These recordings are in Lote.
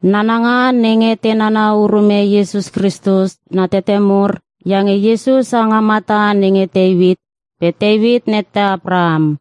Nananga nenge te nana urume Iesus Kristus na tete mur iange Iesus ha nga mata nenge Teuit pe Teuit nette Apraham.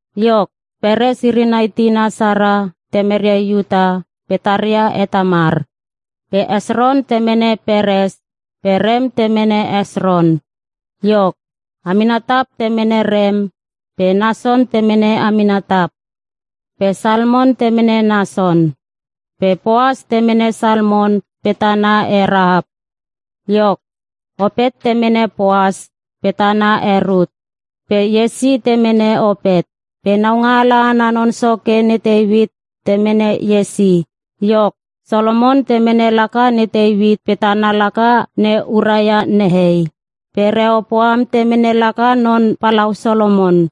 Iok, Peres iri nai tina Sara temeria Iuta pe taria he Tamar. Pe Hesron temene Peres pe Rem temene Hesron. Iok, Aminatap temene Rem pe Nason temene Aminatap. Pe Salmon temene Nason. Pe Poas temene Salmon pe tana he Rahap. Iok, Opet temene Poas pe tana he Rut. Pe Iese temene Opet. Pe Naungaala ana non soke ne Teuit temene Iese. Iok, Solomon temene laka ne Teuit pe tana laka ne Uraia nehei. Pe Rehopoam temene laka non palau Solomon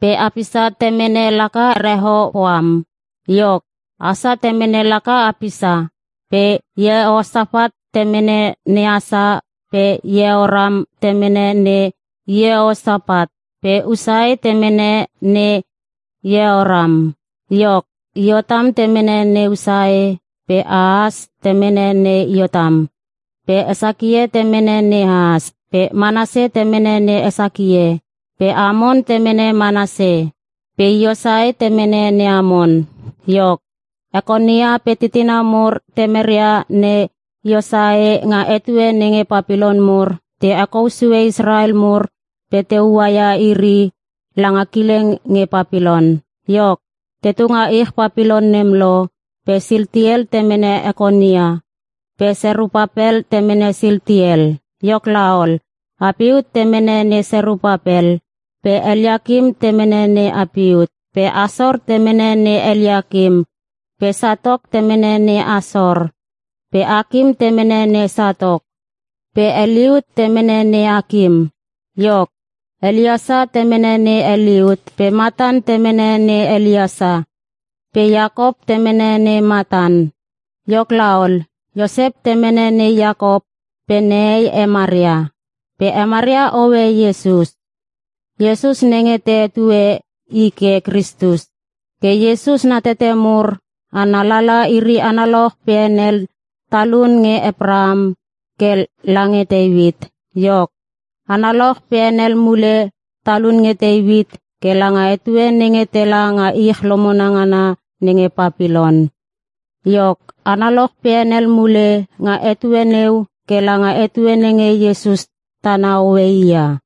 pe Apisa temene laka Rehopoam. Iok, Asa temene laka Apisa. Pe Iehosapat temene ne Asa pe Iehoram temene ne Iehosapat. Pe Usae temene ne Iehoram. Iok, Iotam temene ne Usae pe Ahas temene ne Iotam. Pe Hesakie temene ne Ahas. Pe Manase temene ne Hesakie pe Amon temene ne Manase. Pe Iosae temene ne Amon. Iok, Ekonia pe titina mur temeria ne Iosae nga etue nenge Papilon mur te hekou sue Israel mur pe te ua ia iri langa kileng nge Papilon. Iok, tetu nga ich Papilon nem lo pe Siltiel temene Ekonia pe Serupapel temene Siltiel. Iok laol, Apiut temene ne Serupapel pe Eliakim temene ne Apiut. Pe Asor temene ne Eliakim. pe Satok temene ne Asor pe Akim temene ne Satok pe Eliut temene ne Akim. Iok, Eliesa temene ne Eliut pe Matan temene ne Eliesa pe Iakop temene ne Matan. Iok ol, Iosep temene ne Iakop pe nehei he Maria. Pe he Maria hoe Iesus. Iesus nenge te hetue I ke Kristus. Ke Iesus na tete mur ana lala iri analoch pe henel talun nge Apraham ke lange Teuit. Iok, analoch pe henel mule talun nge Teuit ke langa etue nenge tela nga ich lomona ngana nenge Papilon. Iok, analoch pe henel mule nga etue neu ke langa etue nenge Iesus tana hoe i ia.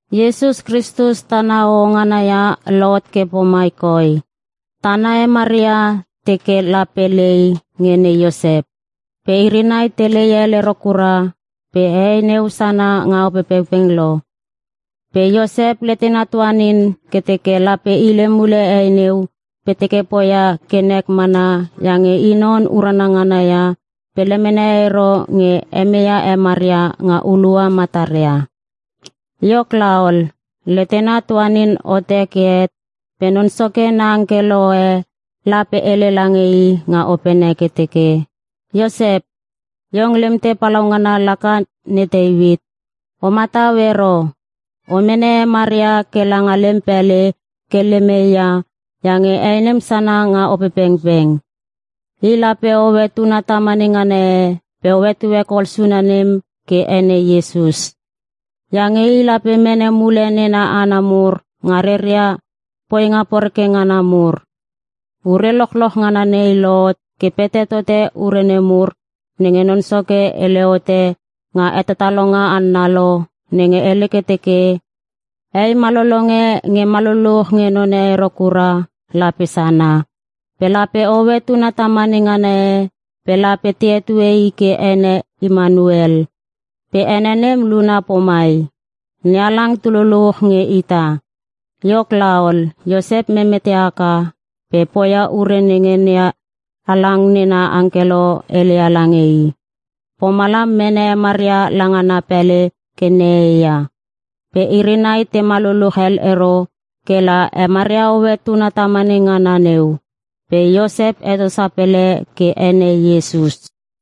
Iesus Kristus tana hoho ngana ia lohot ke pomai koi. Tana he Maria te teke lape lei nge ne Iosep. Pe iri nai te lei hel ero kura pe hei neu sana nga Opepengpeng lo. Pe Iosep letena tuanin ke teke lape hile mule hei neu pe teke poia ke nek mana iange i non urana ngana ia pe lemene ero nge hemeia he Maria nga hulua mataria. Iok laol, letena tuanin hote ke het pe Non Soke na angkelo e la pe hele lange i nga opene ke teke, “Iosep! Iong lemte palaungana laka ne Teuit. O matau ero. O mene he Maria ke langa lem pele ke lem hei ia iange hei nem sana nga Opepengpeng. I lape hoe tuna tamane ngana e pe o hetue kol suna nem ke ene Iesus. Iange i lape mene mule nena hana mur nga reria poinga poreke ngana mur.” Ure lochloch ngana nei lohot ke pete tote ure nemur nenge Non Soke hele hote nga hetatalonga hanna lo nenge hele ke teke, “Hei malolong e nge maluluch nge non e ero kura lape sana. Pe lape hoe tuna tamane ngana e pe lape te hetue i ke ene Imanuel.” Pe ene nem luna pomai, “NeHalang tu luluch nge ita.” Iok laol, Iosep memete haka pe poia ure nenge NeHalang nena angkelo heleia lange i. Pomalam mene he Maria langa na pele ke nehei ia. Pe iri nai tema luluch hel ero ke la he Maria hoe tuna tamane ngana neu. Pe Iosep heto sapele ke ene Iesus.